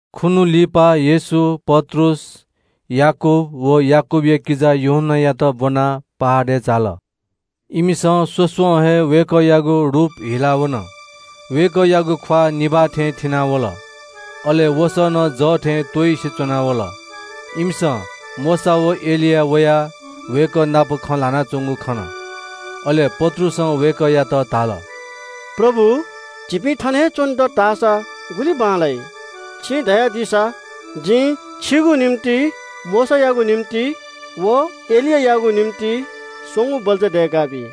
खुन्‍हु लिपा येशू पत्रुस, याकूब व याकूबया किजा यूहन्‍नायात ब्‍वनाः तज्‍जाःगु पर्वतय् झाल। इमिसं स्‍वस्‍वं हे वय्‌कःयागु रूप हिला वन। वय्‌कःयागु ख्‍वाः निभाः थें थिनावल, अले वसः नं जः थें त्‍वइसे च्‍वना वल। इमिसं मोशा व एलिया वयाः वय्‌कः नाप खँ ल्‍हानाच्‍वंगु खन। अले पत्रुसं वय्‌कःयात धाल – “प्रभु, झीपिं थन हे च्‍वने दत धाःसा गुलि बांलाइ। छिं धयादीसा जिं छिगु निंतिं, मोशायागु निंतिं व एलियायागु निंतिं स्‍वंगू बल्‍चा दय्‌काबी।”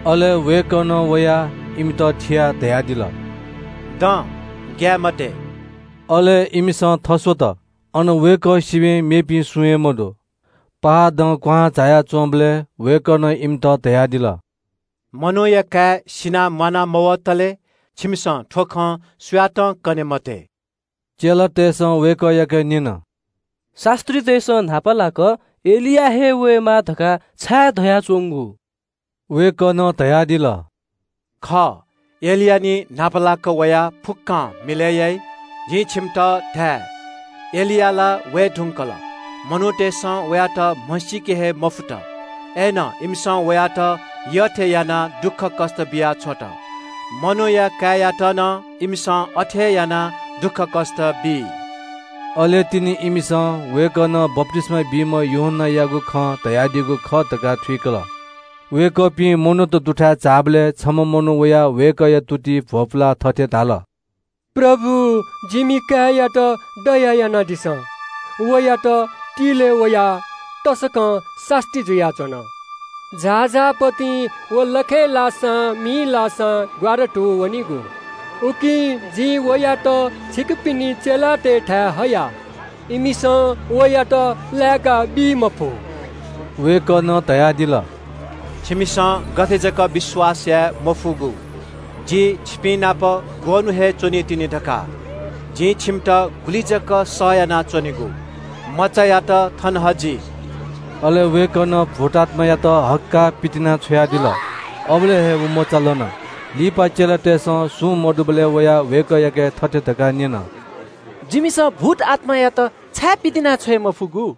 अले वय्‌कलं वयाः इमित थियाः धयादिल – “दँ, ग्‍याये मते।” अले इमिसं थस्‍वत, अन वय्‌कः सिबय् मेपिं सुं हे मदु। पर्वतं क्‍वहां झाया च्‍वंबलय् वय्‌कलं इमित धयादिल – “मनूया काय् सिनाः म्‍वाना मवतले छिमिसं थ्‍व खँ सुयातं कने मते।” चेलातय्‌सं वय्‌कःयाके न्‍यन – “शास्‍त्रीतय्‌सं न्‍हापालाक एलिया हे वयेमाः धकाः छाय् धयाच्‍वंगु?” वय्‌कलं धयादिल – “खः, एलिया निं न्‍हापालाक वयाः फुक्‍कं मिलय् याइ। जिं छिमित धाये – एलिया ला वये धुंकल। इमिसं वयात म्‍हमसील। इमिसं वयात यःयःथें यात। मनूया काय्‌यात नं इमिसं अथे हे यानाः दुःखकष्‍ट बी।” अले तिनि इमिसं वय्‌कलं बप्‍तिस्‍मा बीम्‍ह यूहन्‍नायागु खँ धयादीगु खः धकाः थुइकल। वय्‌कःपिं मनूत दुथाय् झाःबलय् छम्‍ह मनू वयाः वय्‌कःया तुतिइ भ्‍वपुलाः थथे धाल – “प्रभु, जिमि काय्‌यात दया यानादिसँ। वयात तिल्‍वय् वयाः तसकं सास्‍ती जुयाच्‍वन। झाःझाः पतिं व लखय् लाःसां मिइ लाःसां ग्‍वारातू वनीगु। उकिं जिं वयात छिकपिनि चेलातय्‌थाय् हया। इमिसं वयात लाय्‌काबी मफु।” वय्‌कलं धयादिल – “छिमिसं गथे जक विश्‍वास याये मफुगु? जि छिपिंनाप ग्‍वःन्‍हु हे च्‍वनीतिनि धकाः? जिं छिमित गुलि जक सह यानाच्‍वनेगु? मचायात थन हजि।” अले वय्‌कलं भूतआत्‍मायात हक्‍काः पितिनाछ्वयादिल। अबलय् हे व मचा लन। लिपा चेलातय्‌सं सुं मदुबलय् वयाः वय्‌कःयाके थथे धकाः न्‍यन – “जिमिसं भूतआत्‍मायात छाय् पितिनाछ्वये मफुगु?”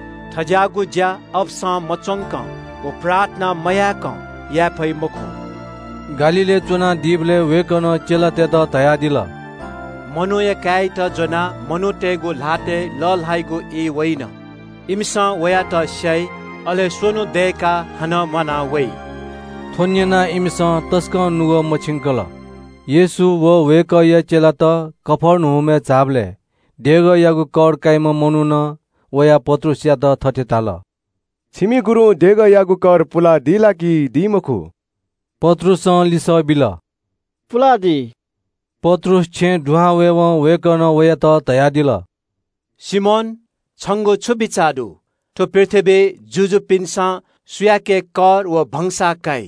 थज्‍याःगु ज्‍या अपसं मच्‍वंकं व प्रार्थना मयाय्‌कं याये फइ मखु।” गालीलय् च्‍वनादीबलय् वय्‌कलं चेलातय्‌त धयादिल – “मनूया काय्‌यात ज्‍वनाः मनूतय्‌गु ल्‍हातय् लःल्‍हाइगु ई वइन। इमिसं वयात स्‍याइ, अले स्‍वन्‍हु दय्‌काः हानं म्‍वाना वइ।” थ्‍व न्‍यनाः इमिसं तसकं नुगः मछिंकल। येशू व वय्‌कःया चेलात कफर्नहुमय् झाःबलय् देगःयागु कर काइम्‍ह मनुखं वयाः पत्रुसयात थथे धाल – “छिमि गुरुं देगःयागु कर पुलादी ला कि दी मखु?” पत्रुसं लिसः बिल – “पुलादी।” पत्रुस छेँय् दुहां वयेवं वय्‌कलं वयात धयादिल – “सिमोन, छंगु छु बिचाः दु? थ्‍व पृथ्‍वीइ जुजुपिन्‍सं सुयाके कर व भंसाः काइ?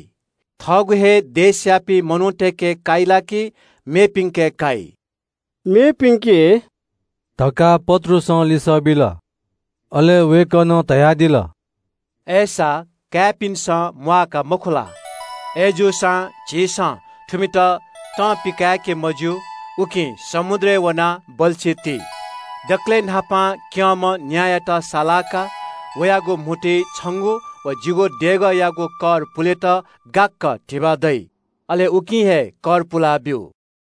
थः काय्‌पिन्‍के काइ ला कि मेपिन्‍के काइ?” “मेपिन्‍के” धकाः पत्रुसं लिसः बिल। अले वय्‌कलं धयादिल – “अय्‌सा काय्‌पिन्‍सं म्‍वाः का मखु ला? अय्‌जूसां झीसं थुमित तं पिकाय्‌के मज्‍यू, उकिं समुद्रय् वनाः बल्‍छी ति। दकलय् न्‍हापां क्‍यंम्‍ह न्‍यायात सालाः का। वयागु म्‍हुतुइ छंगु व जिगु देगःयागु कर पुलेत गाक्‍क धिबा दइ। अले उकिं हे कर पुलाब्‍यु।”